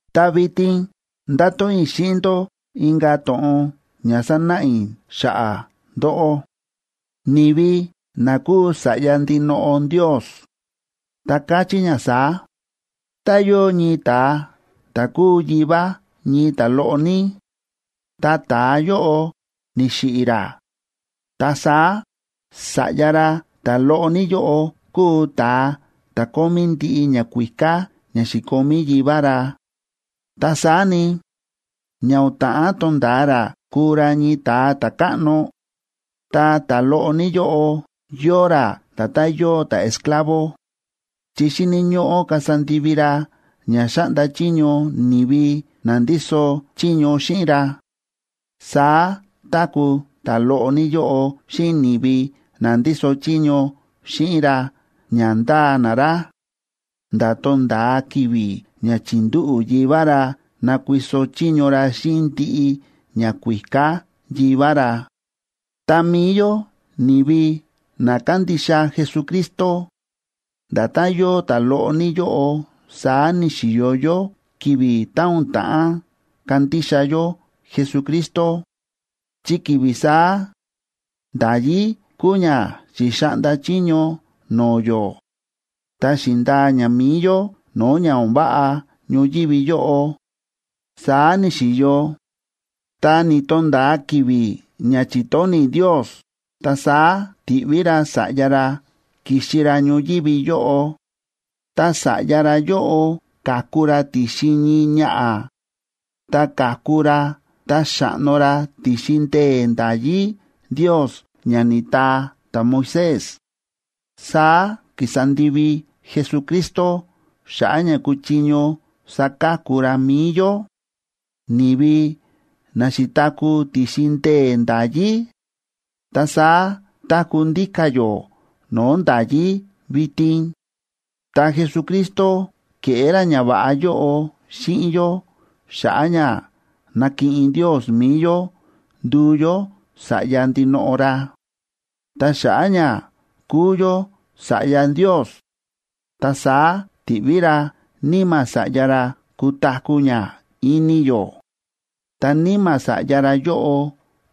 Ta vitin ndáto̱ꞌon i̱ xíꞌin ndó inka̱ to̱ꞌon ña sanáꞌa i̱ xa̱ꞌa̱ ndóꞌó, ni̱vi na kúu sa̱ꞌya ndinoꞌo Ndios, ta káchí ña saá: Tá yóo ñii ta̱a ta̱ kúu yivá ñii ta̱loꞌo ní, ta ta̱a yóꞌo ni̱xiꞌi̱ ra, ta saá sa̱ꞌya ra ta̱loꞌo ní yóꞌo kúu ta̱a ta̱ kómí ndiꞌi ñakuíká ña xi̱komí yivá ra. Ta saá ni, ña o̱n ta̱ꞌán tonda̱a ra kuu ra ñii ta̱a ta̱káꞌno, ta ta̱loꞌo ní yóꞌo yóo ra nda̱tán yóo ta̱esclavo, chi xíni̱ ñóꞌó kasa ndivi ra ña xáꞌnda chiño ni̱vi na ndíso chiño xíꞌin ra. Saá táku̱ ta̱loꞌo ní yóꞌo xíꞌin ni̱vi na ndíso chiño xíꞌin ra ña ndáa na ra, nda̱ tonda̱a ki̱vi̱ ña chi̱ndúꞌu̱ yivá ra nakuiso chiño ra xíꞌin ndiꞌi ñakuíká yivá ra. Ta mi̱i yó ni̱vi na kándixa Jesucristo nda̱tán yóo ta̱loꞌo ní yóꞌo saá ni̱xi̱yo yó ki̱vi̱ tá o̱n ta̱ꞌán kandixa yó Jesucristo, chi ki̱vi̱ saá nda̱yí kúu ña xi̱xaꞌnda chiño no̱o̱ yó ta xi̱ndaa ña mi̱i yó no̱o̱ ña o̱n váꞌa ñoyívi yóꞌo. Saá ni̱xi̱yo, ta ni̱to̱nda̱a ki̱vi̱ ña chi̱tóni̱ Ndios, ta saá ti̱ꞌví ra Sa̱ꞌya ra ki̱xi ra ñoyívi yóꞌo. Ta Sa̱ꞌya ra yóꞌo ka̱ku ra ti̱xin ñii ñaꞌa̱, ta ka̱ku ra ta xa̱ꞌno ra ti̱xin ndee̱ nda̱yí Ndios ña ni̱taa ta̱Moisés. Saá ki̱sa ndivi Jesucristo xa̱ꞌa̱ ña kúchiño saka̱ku ra mi̱i yó, ni̱vi na xi̱taku̱ ti̱xin ndee̱ nda̱yí, ta saá táku̱ ndíka̱ yó no̱o̱ nda̱yí vitin. Ta Jesucristo ke̱ꞌé ra ñava̱ꞌa yóꞌo xíꞌin yó xa̱ꞌa̱ ña nakiꞌin Ndios mi̱i yó nduu yó sa̱ꞌya ndinoꞌo ra. Ta xa̱ꞌa̱ ña kúu yó sa̱ꞌya Ndios, ta saá ti̱ꞌví ra Níma̱ Sa̱ꞌya ra kutaku̱ ña ini yó. Ta Níma̱ Sa̱ꞌya ra yóꞌo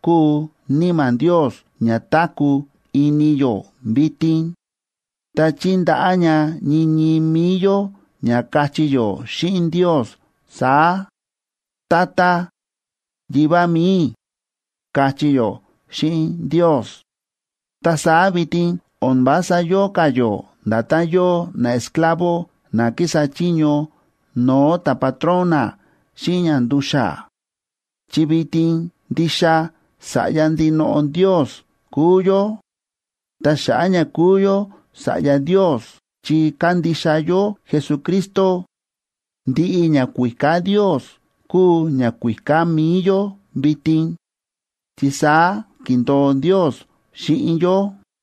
kúu Níma̱ Ndios ña táku̱ ini yó vitin, ta chíndaꞌá ña ñii ñii mi̱i yó ña kachí yó xíꞌin Ndios saá: “¡Tata Yivá mi̱i i̱!”, káchí yó xíꞌin Ndios. Ta saá vitin o̱n vása yóo ka̱ yó nda̱tán yóo naesclavo na kísa chiño no̱o̱ ta̱patrón na xíꞌin ña ndu̱xa̱, chi vitin ndixa sa̱ꞌya ndinoꞌo Ndios kúu yó. Ta xa̱ꞌa̱ ña kúu yó sa̱ꞌya Ndios chi kándixa yó Jesucristo, ndiꞌi ñakuíká Ndios kúu ñakuíká mi̱i yó vitin, chi saá ki̱ndo̱o Ndios xíꞌin yó.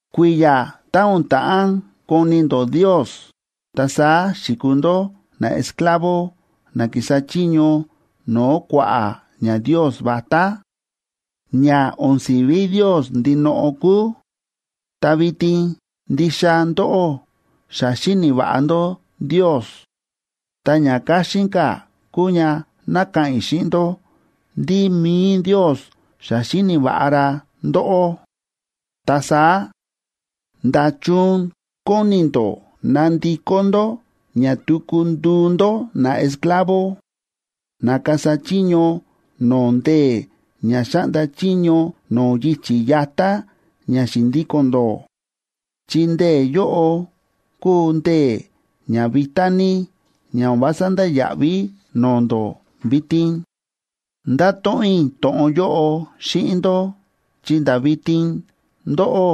Kui̱ya̱ tá o̱n ta̱ꞌán koni̱ ndó Ndios, ta saá xi̱kuu ndó naesclavo na kísa chiño no̱o̱ kua̱ꞌa̱ ñandios vatá, ña o̱n si̱ví Ndios ndinoꞌo kúu. Ta vitin ndixa ndóꞌó xa xíni̱ va̱ꞌa ndó Ndios, ta ña káxín ka̱ kúu ña ná ka̱ꞌa̱n i̱ xíꞌin ndó ndí mi̱i Ndios xa xíni̱ va̱ꞌa ra ndóꞌó. Ta saá, ¿nda̱chun kóni ndó nandikó ndó ña tuku nduu ndó naesclavo, na kasa chiño no̱o̱ ndee̱ ña xáꞌnda chiño no̱o̱ yichi̱ yatá ña xi̱ndíko̱n ndó?, chi ndee̱ yóꞌo kúu ndee̱ ña vitá ní ña o̱n vása ndáya̱ꞌví no̱o̱ ndó vitin. Ndáto̱ꞌon i̱ to̱ꞌon yóꞌo xíꞌin ndó chi nda̱ vitin ndóꞌó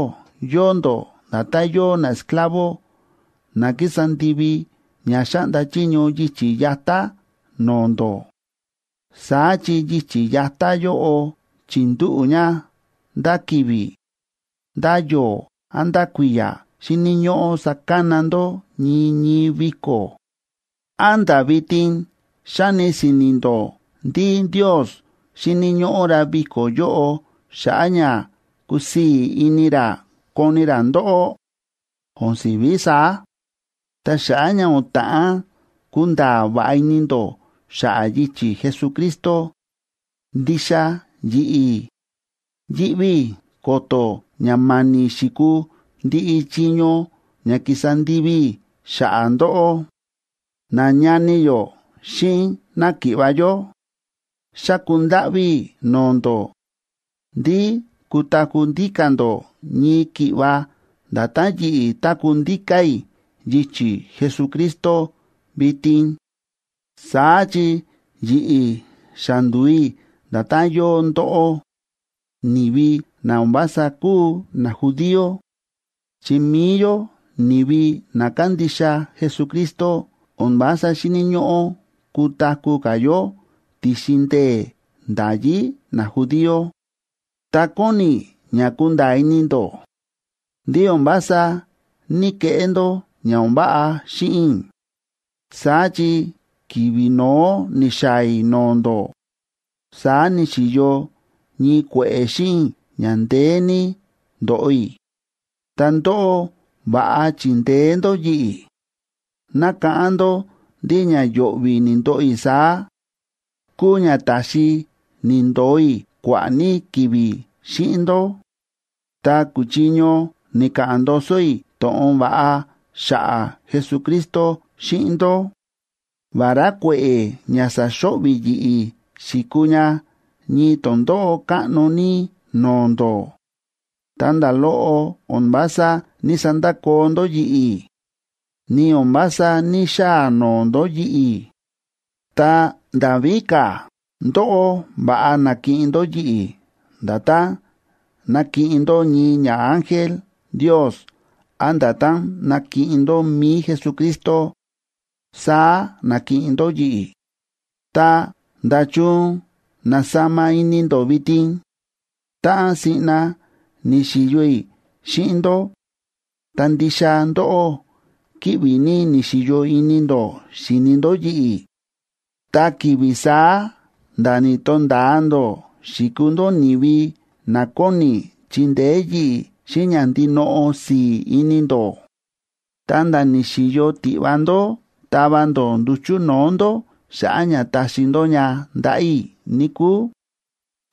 yóo ndó nda̱tán yóo naesclavo na kísa ndivi ña xáꞌnda chiño yichi̱ yatá no̱o̱ ndó. Saá chi yichi̱ yatá yóꞌo chi̱ndúꞌu̱ ña ndá ki̱vi̱, ndá yo̱o̱, án ndá kui̱ya̱ xíni̱ ñóꞌó sakana ndó ñii ñii viko̱. ¿Án nda̱ vitin xáni si̱ni̱ ndó ndí Ndios xíni̱ ñóꞌó ra viko̱ yóꞌo xa̱ꞌa̱ ña kusii̱ ini ra koni ra ndóꞌó? ¡O̱n si̱ví saá! Ta xa̱ꞌa̱ ña o̱n ta̱ꞌán kunda̱a̱ va̱ꞌa ini ndó xa̱ꞌa̱ yichi̱ Jesucristo, ndixa yi̱ꞌi̱ yíꞌví i̱ ko̱to̱ ña ma̱ni̱ xi̱kuu ndiꞌi chiño ña ki̱sa ndivi i̱ xa̱ꞌa̱ ndóꞌó. Nañani yó xíꞌin náki̱ꞌva̱ yó, xáku ndáꞌví i̱ no̱o̱ ndó ndí kutaku̱ ndíka̱ ndó ñii ki̱ꞌva nda̱tán yi̱ꞌi̱ táku̱ ndíka̱ i̱ yichi̱ Jesucristo vitin. Saá chi yi̱ꞌi̱ xa ndu̱u i̱ nda̱tán yóo ndóꞌó, ni̱vi na o̱n vása kúu najudío, chi mi̱i yó, ni̱vi na kándixa Jesucristo, o̱n vása xíni̱ ñóꞌó kutaku̱ ka̱ yó ti̱xin ndee̱ nda̱yí najudío. Ta kóni i̱ ña kunda̱a̱ ini ndó ndí o̱n vása ní‑keꞌé ndó ña o̱n váꞌa xíꞌin i̱. Saá chi ki̱vi̱ no̱ó ni̱xaa̱ i̱ no̱o̱ ndó, saá ni̱xi̱yo ñii kue̱ꞌe̱ xíꞌin i̱ ña ndeé ní ndóꞌo i̱, ta ndóꞌó va̱ꞌa chi̱ndeé ndó yi̱ꞌi̱. Nákáꞌán ndó ndí ña yo̱ꞌvi̱ ni̱ndoꞌo i̱ saá, kúu ña ta̱xi ni̱ndo̱o i̱ kua̱ꞌa̱ ní ki̱vi̱ xíꞌin ndó, ta ku̱chiño ni̱ka̱ꞌa̱n ndoso i̱ to̱ꞌon va̱ꞌa xa̱ꞌa̱ Jesucristo xíꞌin ndó. Vará kue̱ꞌe̱ ña sa̱xo̱ꞌvi̱ yi̱ꞌi̱ xi̱kuu ña ñii tondóꞌó káꞌno ní no̱o̱ ndó, ta nda̱ loꞌo o̱n vása ní‑sandakoo ndó yi̱ꞌi̱, ni o̱n vása ní‑xaa noo ndó yi̱ꞌi̱. Ta nda̱ víka̱, ndóꞌó va̱ꞌa na̱kiꞌin ndó yi̱ꞌi̱ nda̱tán nakiꞌin ndó ñii ñaángel Ndios án nda̱tán nakiꞌin ndó mi̱i Jesucristo, saá na̱kiꞌin ndó yi̱ꞌi̱. Ta, ¿nda̱chun na̱sama ini ndó vitin? Táꞌan siꞌna ni̱xi̱yo i̱ xíꞌin ndó, ta ndixa ndóꞌó kíꞌvi ní ni̱xi̱yo ini ndó xi̱ni ndó yi̱ꞌi̱, ta ki̱vi̱ saá nda̱ ni̱to̱nda̱a ndó xi̱kuu ndó ni̱vi na kóni chindeé yi̱ꞌi̱ xíꞌin ña ndinoꞌo si̱i̱ ini ndó, ta̱nda̱ ni̱xi̱yo tiꞌva ndó tava ndó nduchu̱ no̱o̱ ndó xa̱ꞌa̱ ña taxi ndó ña ndaꞌa̱ i̱, níkúu.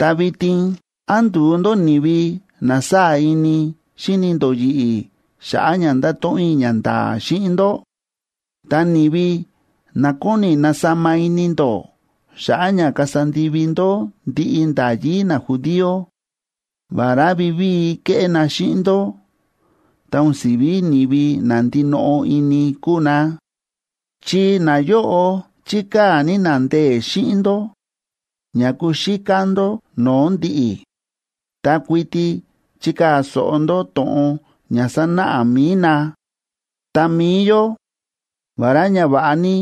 Ta vitin, ¿án ndu̱u ndó ni̱vi na sáa̱ ini xíni ndó yi̱ꞌi̱ xa̱ꞌa̱ ña nda̱to̱ꞌon i̱ ñanda̱a̱ xíꞌin ndó? Ta ni̱vi na kóni nasama ini ndó xa̱ꞌa̱ ña kasa ndivi ndó ndiꞌi nda̱yí najudío, vará vivíi kéꞌé na xíꞌin ndó, ta o̱n si̱ví ni̱vi na ndinoꞌo ini kúu na. Chi nayóꞌo chíkaa̱ ní na ndee̱ xíꞌin ndó ña kuxíká ndó no̱o̱ ndi̱ꞌi̱ ta kuiti chikaa̱ so̱ꞌo ndó to̱ꞌon ña sánáꞌa mi̱i na. Ta mi̱i yó, vará ña va̱ꞌa ní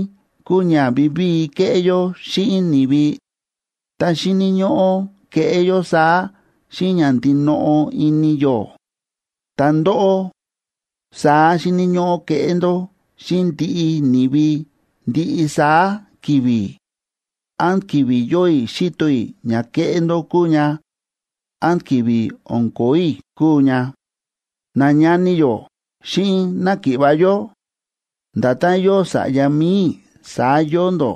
kúu ña vivíi keꞌé yó xíꞌin ni̱vi, ta xíni̱ ñóꞌó keꞌé yó saá xíꞌin ña ndinoꞌo ini yó. Ta ndóꞌó, saá xíni̱ ñóꞌó keꞌé ndó xíꞌin ndiꞌi ni̱vi ndiꞌi saá ki̱vi̱, án ki̱vi̱ yóo i̱ xíto i̱ ña kéꞌé ndó kúu ña, án ki̱vi̱ o̱n kóo i̱ kúu ña. Nañani yó xíꞌin náki̱ꞌva̱ yó, nda̱tán yóo sa̱ꞌya mi̱i i̱, saá yóo ndó.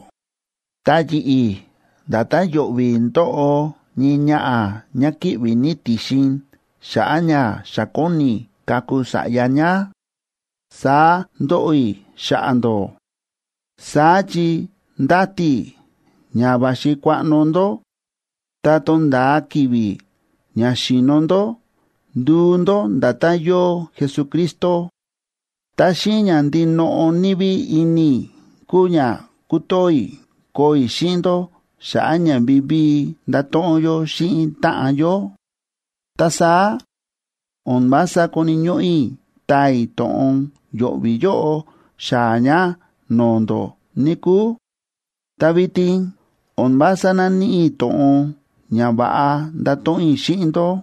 Ta yi̱ꞌi̱, nda̱tán yo̱ꞌvi̱ ndóꞌo ñii ñaꞌa̱ ñá kíꞌvi̱ ní ti̱xin xa̱ꞌa̱ ña xa kóni kaku sa̱ꞌya ñá, saá ndóꞌo i̱ xa̱ꞌa̱ ndó. Saá chi ndáti i̱ ña va̱xi kuaꞌno ndó ta tonda̱a ki̱vi̱ ña xi̱no̱ ndó nduu ndó nda̱tán yóo Jesucristo. Ta xíꞌin ña ndinoꞌo ní ví ini i̱ kúu ña kútoo i̱ koo i̱ xíꞌin ndó xa̱ꞌa̱ ña vivíi ndato̱ꞌon yó xíꞌin táꞌan yó. Ta saá o̱n vása koni̱ ñóꞌó i̱ taa i̱ to̱ꞌon yo̱ꞌvi̱ yóꞌo xaa̱ ña no̱o̱ ndó, níkúu. Ta vitin o̱n vása náníꞌi i̱ to̱ꞌon ña va̱ꞌa ndato̱ꞌon i̱ xíꞌin ndó.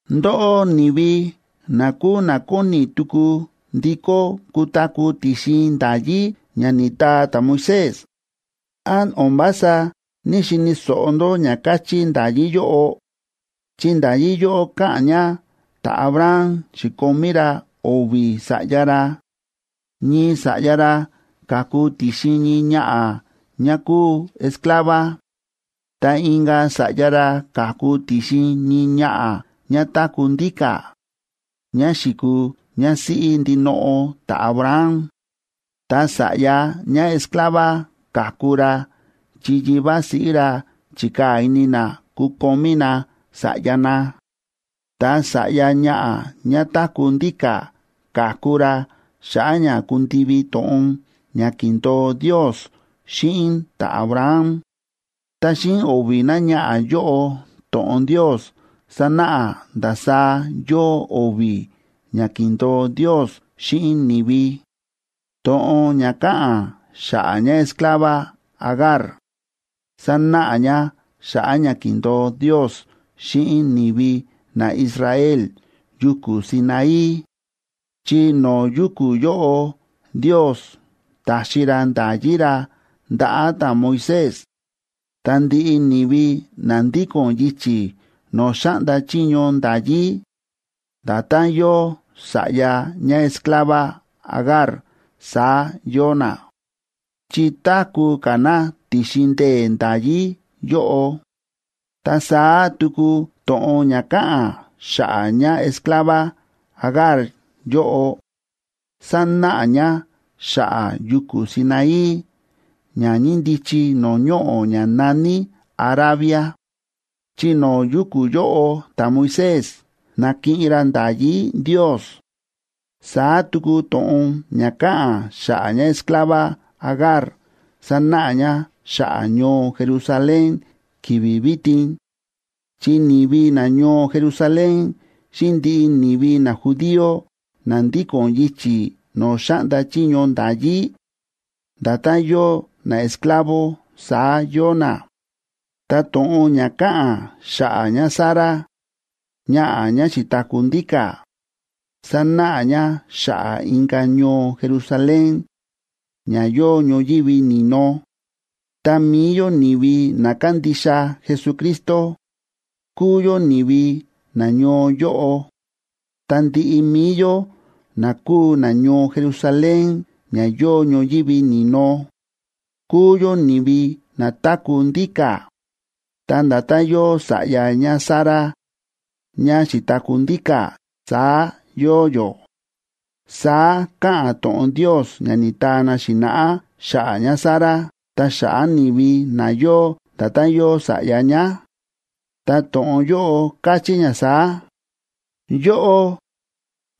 Ndóꞌó, ni̱vi na kúu na kóni tuku ndikó kutaku̱ ti̱xin nda̱yí ña ni̱taa ta̱Moisés, ¿án o̱n vása ní‑xini̱ so̱ꞌo ndó ña káchí nda̱yí yóꞌo? Chi nda̱yí yóꞌo káꞌa̱n ña ta̱Abraham xi̱komí ra o̱vi̱ sa̱ꞌya ra. Ñii sa̱ꞌya ra ka̱ku ti̱xin ñii ñaꞌa̱ ñá kúu esclava. Ta inka̱ sa̱ꞌya ra ka̱ku ti̱xin ñii ñaꞌa̱ ñá táku̱ ndíka̱, ñá xi̱kuu ñásíꞌí ndinoꞌo ta̱Abraham. Ta sa̱ꞌya ñáesclava ka̱ku ra chi yivá siꞌí ra chi̱kaa̱ ini na kukomí na sa̱ꞌya na. Ta sa̱ꞌya ñaꞌa̱ ñá táku̱ ndíka̱ ka̱ku ra xa̱ꞌa̱ ña kundivi to̱ꞌon ña ki̱ndo̱o Ndios xíꞌin ta̱Abraham. Ta xíꞌin o̱vi̱ náñaꞌa̱ yóꞌo to̱ꞌon Ndios sánáꞌa ndasaá yóo o̱vi̱ ña ki̱ndo̱o Ndios xíꞌin ni̱vi. To̱ꞌon ña káꞌa̱n xa̱ꞌa̱ ñáesclava Agar sánáꞌa ña xa̱ꞌa̱ ña ki̱ndo̱o Ndios xíꞌin ni̱vi naIsrael yuku̱ Sinaí, chi no̱o̱ yuku̱ yóꞌo Ndios ta̱xi ra nda̱yí ra ndaꞌa̱ ta̱Moisés. Ta ndiꞌi ni̱vi na ndíko̱n yichi̱ no̱o̱ xáꞌnda chiño nda̱yí, nda̱tán yóo sa̱ꞌya ñáesclava Agar saá yóo na, chi táku̱ ka̱ na ti̱xin ndee̱ nda̱yí yóꞌo. Ta saá tuku to̱ꞌon ña káꞌa̱n xa̱ꞌa̱ ñáesclava Agar yóꞌo sánáꞌa ña xa̱ꞌa̱ yuku̱ Sinaí ña ñíndichi no̱o̱ ñoꞌo̱ ña na̱ní Arabia, chi no̱o̱ yuku̱ yóꞌo ta̱Moisés na̱kiꞌin ra nda̱yí Ndios. Saá tuku to̱ꞌon ña káꞌa̱n xa̱ꞌa̱ ñáesclava Agar sánáꞌa ña xa̱ꞌa̱ ñoo Jerusalén ki̱vi̱ vitin, chi ni̱vi nañoo Jerusalén xíꞌin ndiꞌi ni̱vi najudío na ndíko̱n yichi̱ no̱o̱ xáꞌnda chiño nda̱yí, nda̱tán yóo naesclavo saá yóo na. Ta to̱ꞌon ña káꞌa̱n xa̱ꞌa̱ ñáSara, ñaꞌa̱ ñá xi̱taku̱ ndíka̱, sánáꞌa ña xa̱ꞌa̱ inka̱ ñoo Jerusalén ña yóo ñoyívi ni̱no, ta mi̱i yó ni̱vi na kándixa Jesucristo, kúu yó ni̱vi nañoo yóꞌo. Ta ndiꞌi mi̱i yó na kúu nañoo Jerusalén ña yóo ñoyívi ni̱no, kúu yó ni̱vi na táku̱ ndíka̱, ta nda̱tán yóo sa̱ꞌya ñáSara ñá xi̱taku̱ ndíka̱, saá yóo yó. Saá káꞌa̱n to̱ꞌon Ndios ña ni̱taa na xi̱na̱ꞌá xa̱ꞌa̱ ñáSara ta xa̱ꞌa̱ ni̱vi na yóo nda̱tán yóo sa̱ꞌya ñá, ta to̱ꞌon yóꞌo káchí ña saá: Yóꞌó,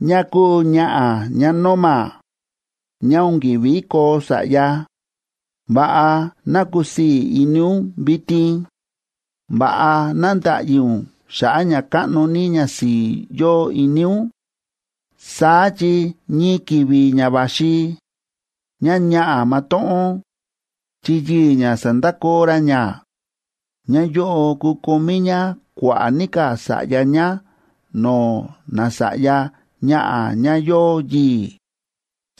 ñá kúu ñaꞌa̱ ñánóma, ñá o̱n ki̱ví koo sa̱ꞌya, ¡va̱ꞌa ná kusii̱ ini ún vitin! ¡Va̱ꞌa ná nda̱ꞌyi ún xa̱ꞌa̱ ña káꞌno ní ñasi̱i̱ yóo ini ún! Saá chi ñii ki̱vi̱ ña va̱xi, ñáñaꞌa̱ matóꞌón, chi yii̱ ñá sa̱ndakoo ra ñá, ñáyóꞌo kukomí ñá kua̱ꞌa̱ ní ka̱ sa̱ꞌya ñá no̱o̱ nasa̱ꞌya ñaꞌa̱ ñá yóo yii̱,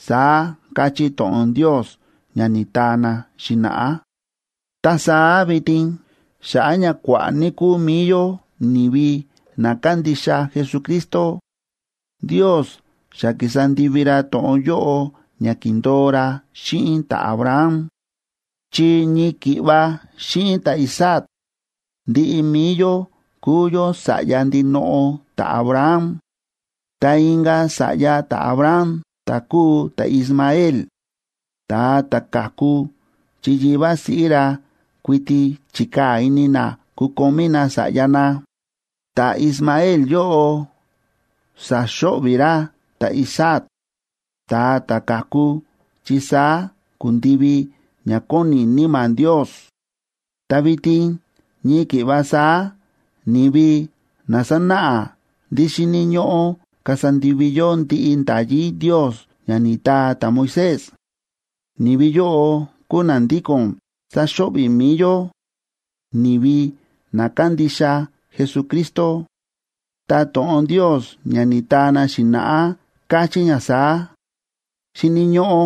saá káchí to̱ꞌon Ndios ña ni̱taa na xi̱na̱ꞌá. Ta saá vitin, xa̱ꞌa̱ ña kua̱ꞌa̱ ní kúu mi̱i yó ni̱vi na kándixa Jesucristo, Ndios xa ki̱sa ndivi ra to̱ꞌon yóꞌo ña ki̱ndo̱o ra xíꞌin ta̱Abraham, chi ñii ki̱ꞌva xíꞌin ta̱Isaac ndiꞌi mi̱i yó kúu yó sa̱ꞌya ndinoꞌo ta̱Abraham. Ta inka̱ sa̱ꞌya ta̱Abraham, ta̱ kúu ta̱Ismael, ta̱a ta̱ ka̱ku chi yivá siꞌí ra kuiti chi̱kaa̱ ini na kukomí na sa̱ꞌya na, ta̱Ismael yóꞌo sa̱xo̱ꞌvi̱ ra ta̱Isaac, ta̱a ta̱ ka̱ku chi saá ku̱ndivi ña kóni Níma̱ Ndios. Ta vitin ñii ki̱ꞌva saá ni̱vi na sánáꞌa ndí xíni̱ ñóꞌó kasa ndivi yó ndiꞌi nda̱yí Ndios ña ni̱taa ta̱Moisés, ni̱vi yóꞌo kúu na ndíko̱n sáxo̱ꞌvi̱ mi̱i yó, ni̱vi na kándixa Jesucristo. Ta to̱ꞌon Ndios ña ni̱taa na xi̱na̱ꞌá, káchí ña saá: “Xíni̱ ñóꞌó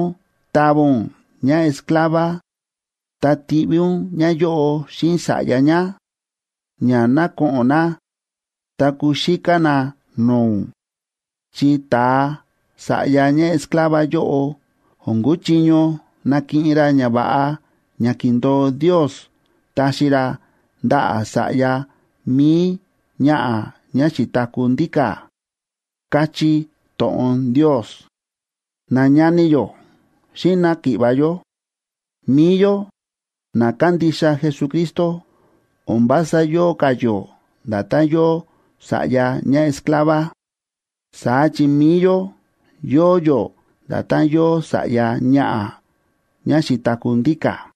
tava ún ñáesclava, ta tiꞌví ún ñáyóꞌo xíꞌin sa̱ꞌya ñá, ña ná ko̱ꞌo̱n na ta kuxíká na no̱o̱ ún. Chi ta̱a sa̱ꞌya ñáesclava yóꞌo o̱n kuchiño nakiꞌin ra ñava̱ꞌa ña ki̱ndo̱o Ndios taxi ra ndaꞌa̱ sa̱ꞌya mi̱i ñaꞌa̱ ñá xi̱taku̱ ndíka̱”, káchí to̱ꞌon Ndios. Nañani yó xíꞌin náki̱ꞌva̱ yó, mi̱i yó na kándixa Jesucristo o̱n vása yóo ka̱ yó nda̱tán yóo sa̱ꞌya ñáesclava. Saá chi mi̱i yó yóo yó nda̱tán yóo sa̱ꞌya ñaꞌa̱ ñá xi̱taku̱ ndíka̱.